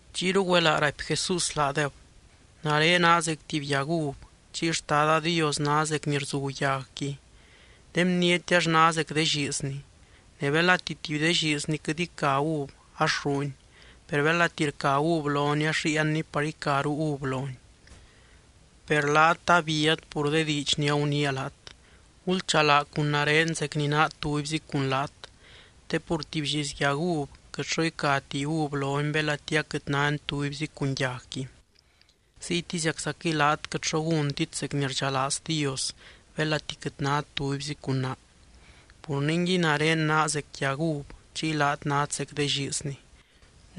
Chiyru güelaa raipy Jesús laadeb: —Nare naa zec tuby yag uv, chiy Xtada Dios ná zec ni rzu yagqui. De bniety ax ná zec de lliizni. Ne belati tuby de lliizni quɨt ica uv ax rruuni. Per belati rca uv loni ax ríiani par icaru uv loni. Per laat abíat pur de diidx ni aguniia laat. Gulchalaa cun nare zec ni naa tubyzi cun laat. Te pur tuby lliiz yag uv quɨt xo icati uv loni belati aquɨt náni tubyzi cun yagqui. Ziytiziaczaquɨy laat quɨt xo gúntit zec ni rdxalaaz Dios belati quɨt nát tubyzi cun naa. ’Pur ningui nare naa zec yag uv chiy laat nát zec de lliizni.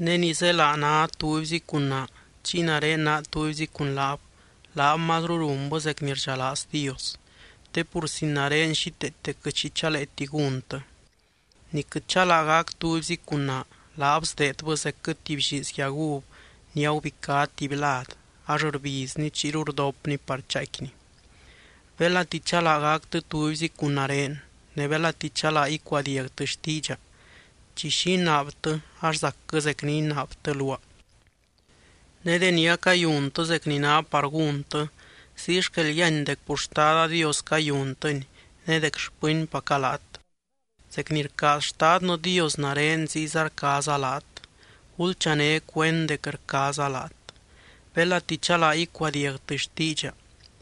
Ne ni zélaa ná tubyzi cun naa chiy nare naa tubyzi cun laab, laab mazru runbɨ zec ni rdxalaaz Dios. Te pur sin nare xíteete quɨt xi chaleeti gúntɨ. Ni quɨt chalaa gac tubyzi cun naa, laab sdeedbɨ zecquɨ tuby lliiz yag uv ni agubicá tuby lad ax rbizni chiyru rdopni par chaaicquini. ’Belati chalaa gactɨ tubyzi cun nare, ne belati chalaa icuadiagtɨ xtiidxa, chi xi inaabtɨ ax zacquɨ zec ni inaabtɨ luaa. Ne deni acayuntɨ zec ni ná par gúntɨ, ziy xquel yíany dec pur Xtada Dios cayuntɨni ne dec xpɨnpaca laat. Zec ni rcaaz Xtadnɨ Dios nare, ziyza rcaaza laat. Gulchané cuend dec rcaaza laat. Belati chalaa icuadiagtɨ xtiidxa,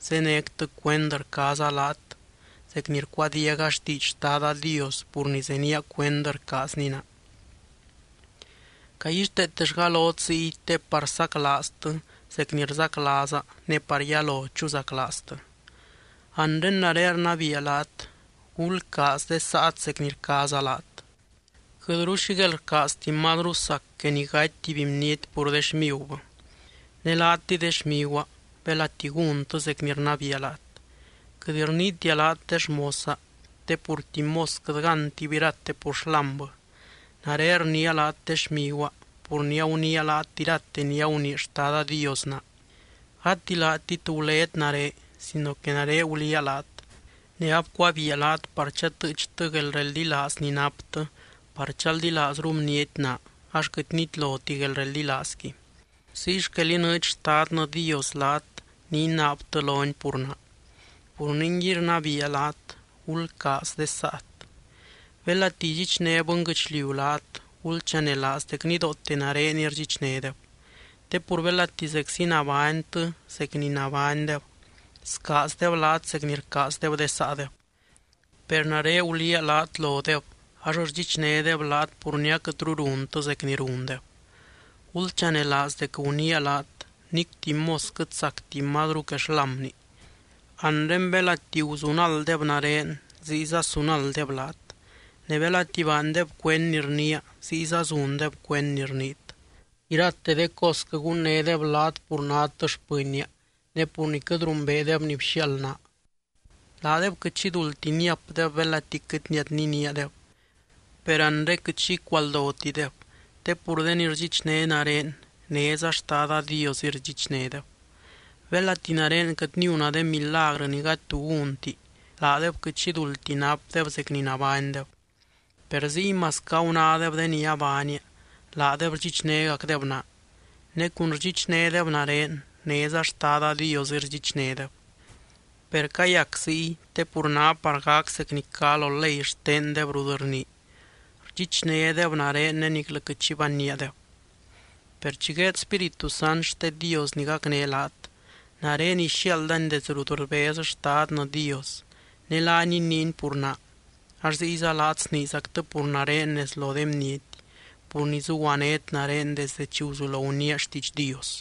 zénectɨ cuend rcaaza laat, zec ni rcuadiaga xtiidx Xtada Dios pur ni zenía cuend rcaazny naa. ’Caguixteetellga lot ziy te par saclaaztɨ zec ni rzaclaaza ne par yalo chuzaclaaztɨ. Anre nare rnabiia laat: Gulcaaz de saat zec ni rcaaza laat. Quɨtru xi guelrcaazti mazru sac que ni gaty tuby bniety pur de xmigubɨ. Ne laatɨy de xmiguaa, belati gúntɨ zec ni rnabiia laat. Quɨt rniitia laat de xmosa, te pur tuby mos quɨt gántib irate pur xlámbɨ. Nare rniia laat de xmiguaa, pur ni aguniia laat irate ni agunii Xtada Dios naa. Gati laatit gulét nare sino que nare guliaa laat, ne abcuabiia laat par chatɨɨchtɨ guelreldilaaz ni naptɨ par chaldilaazru bniety naa ax quɨt nitloti guelreldilaazqui. Ziy xquel inɨɨdx Xtadnɨ Dios laat ni inaabtɨ lony pur naa. Pur ningui rnabiia laat: Gulcaaz de saat. ’Belati idxichné bɨnguɨchliu laat, gulchanelaaz dec nidoote nareniy rdxichnédeb. Te pur belati zeczi nabánytɨ zec ni nabánydeb, scaazdeb laat zec ni rcaazdeb de saadeb. Per nare guliaa laat lodeb ax rdxichnédeb laat pur ni aquɨtru runtɨ zec ni rundeb. Gulchanelaaz dec guniia laat: “Nic tuby mos quɨt sacti mazru que xlámni.” Anre belati guzunalddeb nare ziyza sunalddeb laat. Ne belati baandeb cuend ni rniia ziyza zundeb cuend ni rniit. Irate de cosquɨ gunnédeb laat pur nát xpɨnnia, ne pur ni quɨt rumbeedeb ni bxiaald naa. ’Laadeb quɨt xi duldti niapdeb, belati quɨt niadniníadeb. Per anre quɨt xi icualdotideb, te pur de ni rdxichné nare, néza Xtada Diosɨy rdxichnédeb. Belati nare quɨt niuna de milagrɨ ni gady tu gúnti, laadeb quɨt xi duldti napdeb zec ni nabánydeb. Per ziy masquɨ agunádeb de ni abaania, laadeb rdxichnégacdeb naa. Ne cun rdxichnédeb nare néza Xtada Diosɨy rdxichnédeb. Per cayac ziy, te pur ná par gac zec ni cá lo ley xtendeb rut rnii: “Rdxichnédeb nare ne niclɨ quɨt xi banníadeb.” ’Per chi gueed Spíritu Sant xte Dios ni gacné laat, nare ixiaaldany desdɨ rut rbez Xtadnɨ Dios. Ne laany iniiny pur naa ax ziyza laat sniizactɨ pur nare nez lo de bniety, pur ni zuguanét nare desde chi guzulo guniia xtiidx Dios.